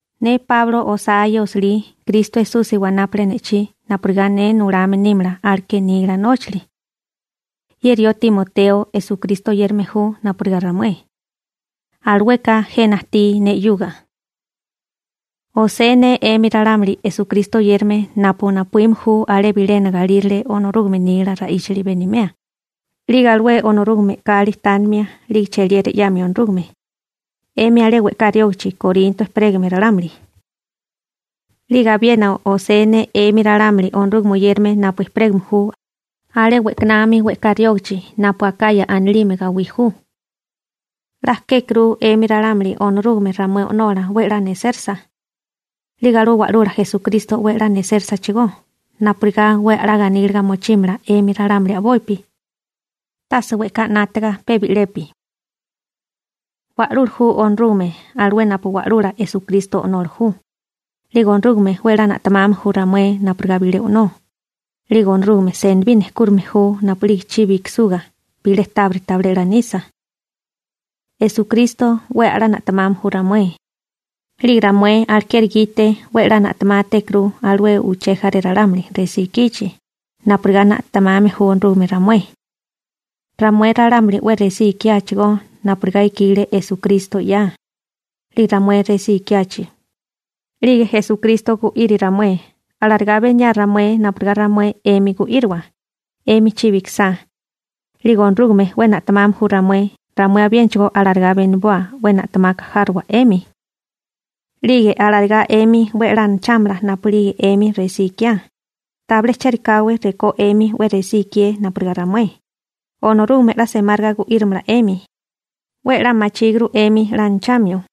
Ne Páulo osá ye osilí. Kristo Esusi wanápale ne'chí napurigá ne nulame nímala aleké nila nóchali. Ye rió Timoteo, Esukristo oyérame ju napurigá ramué, alueka jena ajtí ne 'yuga. Osée ne 'emi ralámuli Esukristo oyérame napu napuíme ju alé bilena galírale Onorúgame nila ra'íchali benimea, 'lige alué Onorúgame e'kali tánimia, 'lige cheliera 'yamia Onorúgame, 'emi alé we'ká riógichi Korinto ejperégame ralámuli. 'Lige abiena osé ne 'emi ralámuli Onorúgame oyérame napu ejperégame ju alé we'kanami we'ká riógichi napu Akaya anilime gawí ju. 'La kékuru 'emi ralámuli Onorúgame ramué O'nola 'we a'lá nesérasa. 'Lige alué Wa'lula Esukristo 'we a'lá nesérosachigó, napurigá 'we a'lá ganíliga mochímala 'emi ralámuli a'bopi, tase we'ká 'nátaga pe bi'lepi. Wa'lula ju Onorúgame, alué napu Wa'lula Esukristo O'nola ju. 'Lige Onorúgame 'we 'la na'temame ju ramué napurigá bilé o'nó. 'Lige Onorúgame senibí nejkúrime ju napu'lige chibi ikisuga, bilé tábiri tabilé 'la nisa. Esukristo 'we a'lá na'temame ju ramué, 'lige ramué alekeri gite 'we 'la na'temátékuru alué uché jaré ralámuli resí ikichi, napurigá na'temame ju Onorúgame ramué. Ramué ralámuli 'we resí ikiáchigó, napurigá ikile Esukristo 'ya. 'Lige ramué resí ikiachi, 'lige Esukristo gu'iri ramué. Alarigá beniaa ramué napurigá ramué 'emi gu'íriwa, 'emi chibi ikisá. 'Lige Onorúgame 'we na'temame ju ramué, ramué abiénachigó alarigá beniboa 'we na'temaka járowa 'emi. 'Lige alarigá 'emi 'we a'lá anachámala napu'lige 'emi resí ikiá. Tabilé chérikáwé rekó 'emi 'we resí ikié napurigá ramué, Onorúgame 'la semáriga gu'írimala 'emi. 'We 'la machíguru 'emi 'la anachamio.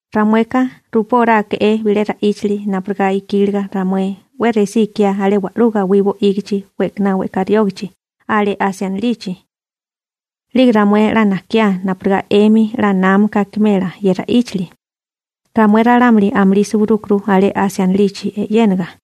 Ramueka rupóráeke'é bilé ra'íchali napurigá ikíliga ramué 'we resí ikiá alé wa'lú gawí bo'ígichi we'kaná we'ká riógichi alé Asia anilichi. 'Lige ramué 'la najkiá napurigá 'emi 'la námaka akimela ye ra'íchali. Ramué ralámuli amulí suwirúkuru alé Asia anilichi e'yénaga.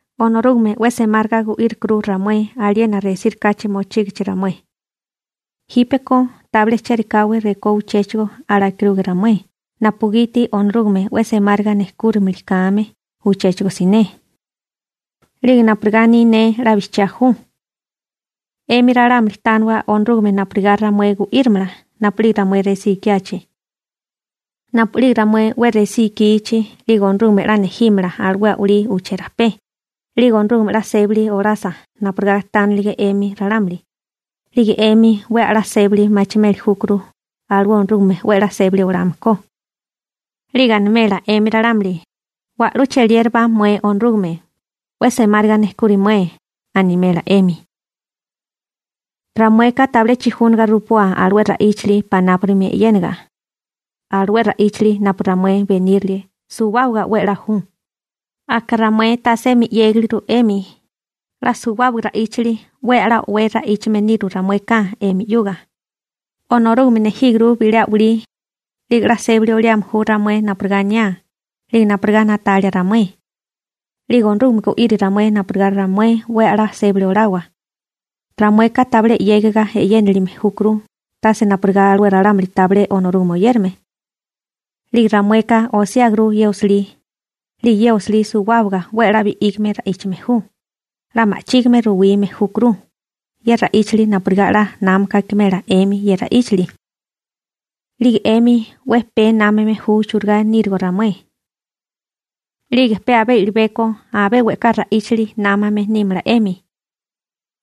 Onorúgame 'we semáriga gu'írikuru ramué aliena resírikáchi mochígichi ramué. Jípeko tabilé chérikáwé rekó uchéchigo alakiruge ramué, napugiti Onorúgame 'we semáriga nejkúrimili kame uchéchigo siné. 'Lige napurigá aní ne 'la bijchiá ju. 'Emi ralámuli tániwa Onorúgame napurigá ramué gu'írimala napu'lige ramué resí ikiachi. Napu'lige ramué 'we resí ikichi, 'lige Onorúgame 'la nejímala alué a'walí uché rajpé. 'Lige Onorúgame 'la sébali olasa napurigá tánilige 'emi ralámuli, 'lige 'emi 'we a'lá sébali machimeli júkuru alué Onorúgame 'we a'lá sébali olame ko. 'Lige animela 'emi ralámuli: «Wa'lú cheliérabá mué Onorúgame, 'we semáriga nejkuri mué», animela 'emi. Ramueka tabilé chijúnaga rupoa alué ra'íchili panápurimi e'yénaga. Alué ra'íchali napu ramué benírilie, suwábaga 'we a'lá ju. Aka ramué tasemi 'yégiliguru 'emi. 'La suwábaga ra'íchili 'we a'lá o'wé ra'íchame niru ramueka 'emi 'yuga. Onorúgame nejíguru bilé a'walí. 'Lige 'la sébali oliame ju ramué napurigá aniá 'lige napurigá na'talia ramué. 'Lige Onorúgame gu'iri ramué napurigá ramué 'we a'lá sébali olawa. Ramueka tabilé 'yégiga e'yenálime júkuru, tase napurigá alué ralámuli tabilé Onorúgame oyérame. 'Lige ramueka osiáguru ye osilí, 'lige ye osilí suwábaga 'we a'lá bi'ígame ra'íchame ju, 'la ma'chígime ruwime júkuru ye ra'íchali napurigá 'la námaka akimela 'emi ye ra'íchili. 'Lige 'emi 'we pee námame ju churigá nírigo ramué, 'lige pe abé i'libeko abé we'ká ra'íchali námame nímala 'emi.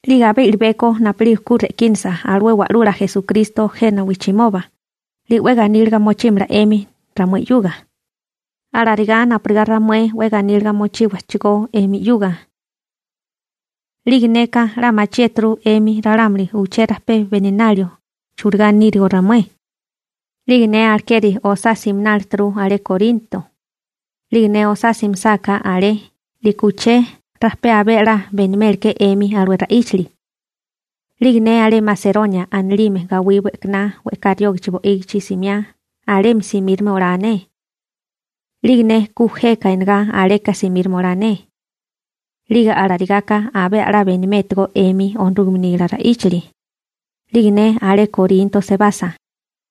'Lige abé i'libeko napu'lige ku re'kínasa alué Wa'lula Esukristo jena wijchimoba, 'lige 'we ganíliga mochímala 'emi ramué 'yuga, alarigá napurigá ramué 'we ganíliga mochíwachigó 'emi 'yuga. 'Lige neka 'la machiéturu 'emi ralámuli uché rajpé beninalio churigá nírigo ramué. 'Lige ne alekeri osá siminálituru alé Korinto. 'Lige ne osá simisáká alé, 'liko uché rajpé abé a'lá benimélike'é 'emi alué ra'íchali. 'Lige ne alé Maseronia anilime gawí we'kaná we'ká riógichi bo'ígichi simiá, alemi simíromala olae ne. 'Lige ne ku jeka enegá aleka simíromala olae ne. 'Lige alarigaka abé a'lá benimétigo 'emi Onorúgame nila ra'íchali. 'Lige ne alé Korinto sebasa,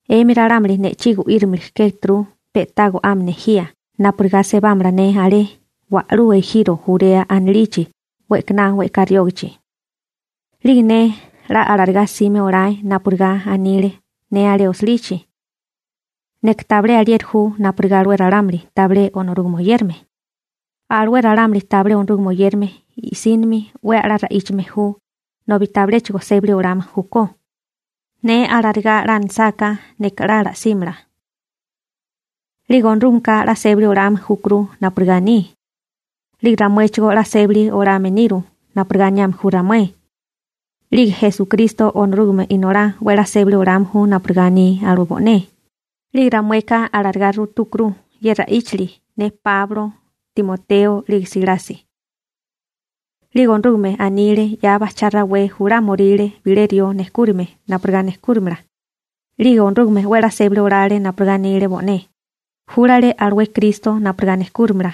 'emi ralámuli ne'chí gu'írimili kéturu, pe'tá go'ame nejía napurigá sebámala ne alé alué wa'lú ejiro Jurea anilichi we'kaná we'ká riógichi. 'Lige ne 'la alarigá simé olae napurigá anile ne alé osilichi. Neka tabilé alieri ju napurigá alué ralámuli tabilé Onorúgame oyérame. Alué ralámuli tabilé Onorúgame oyérame, i'sínimi 'we a'lá ra'íchame ju, nobi tabiléchigo sébali olame júkó. Ne alarigá 'la anisáká, neka 'la simela. 'Lige Onorúgameka 'la sébali olame júkuru napurigá aní. 'Lige ramuéchigó 'la sébali olame niru napurigá aniame ju ramué. 'Lige Esukristo Onorúgame Inolá 'we 'la sébali olame ju napurigá aní alué bo'né, 'lige ramueka alarigá rutúkuru ye ra'íchali, ne Páulo, Timoteo 'lige Silasi. 'Lige Onorúgame anile 'ya bajchá rawé julámoríle bilé rió nejkúrime napurigá nejkúrimala. 'Lige Onorúgame 'we a'lá sébali olale napurigá anile bo'né. Júlale alué Kristo napurigá nejkúrimala.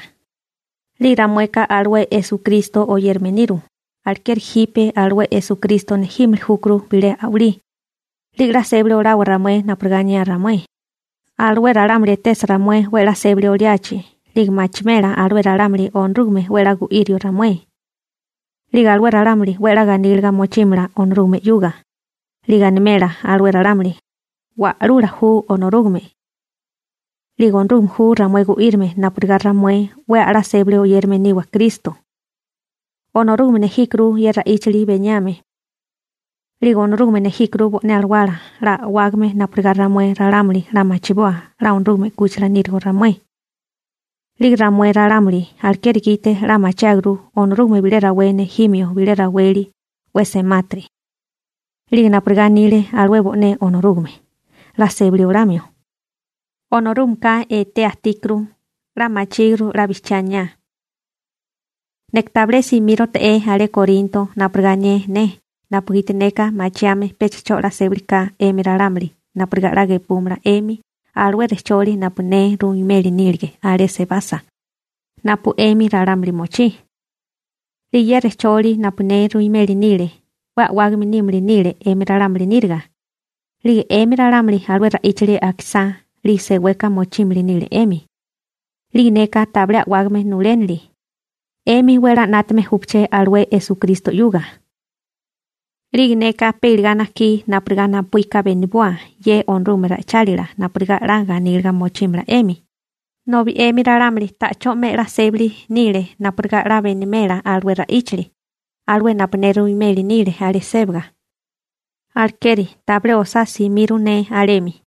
'Lige ramueka alué Esukristo oyérame niru, alekeri jipe alué Esukristo nejímili júkuru bilé a'walí. 'Lige 'la sébali olawa ramué napurigá aniá ramué. Alué ralámuli etesa ramué 'we a'lá sébali oliachi 'lige machimela alué ralámuli Onorúgame 'we a'lá gu'írio ramué. 'Lige alué ralámuli 'we a'lá ganíliga mochímala Onorúgame 'yuga. 'Lige animela alué ralámuli, «Wa'lula ju Onorúgame.» 'Lige Onorúgame ju ramué gu'írame napurigá ramué 'we a'lá sébali oyérame niwa Kristo. Onorúgame nejíkuru ye ra'íchali beniame. 'Lige Onorúgame nejíkuru bo'né Alawala 'la a'wágame napurigá ramué ralámuli 'la machiboa 'la Onorúgame 'kúchila nírigo ramué. 'Lige ramué ralámuli alekeri gite 'la machiáguru Onorúgame bilé rawé nejímio bilé raweli 'we semátiri. 'Lige napurigá anile alué bo'né Onorúgame, 'la sébali olamio. Onorúgameka etea ajtíkuru. 'La machíguru 'la bijchiá aniá. Neka tabilé simírote'é alé Korinto napurigá anié ne napugiti neka machiame pecha 'cho 'la sébali ka 'emi ralámuli napurigá 'la gepúmala 'emi alué rejcholi napu ne ruimeli nílige alé sebasa napu 'emi ralámuli mochí. 'Lige ye rejcholi napu ne ruimeli nile 'we a'wágame nímili nile 'emi ralámuli níriga. 'Lige 'emi ralámuli alué ra'íchali akisá, 'lige seweka mochímili nile 'emi. 'Lige neka tabilé a'wágame nulénili. 'Emi 'we a'lá 'nátame júpaché alué Esukristo 'yuga. 'Lige neka pe iligá najkí napurigá napuíka beniboa ye Onorúgame ra'ichálila napurigá 'la ganíliga mochímala 'emi, nobi 'emi ralámuli ta'chó 'me 'la sébali nile napurigá 'la benimela alué ra'íchali, alué napu ne ruimeli nile alé sébaga. Alekeri tabilé osá simiru ne alemi.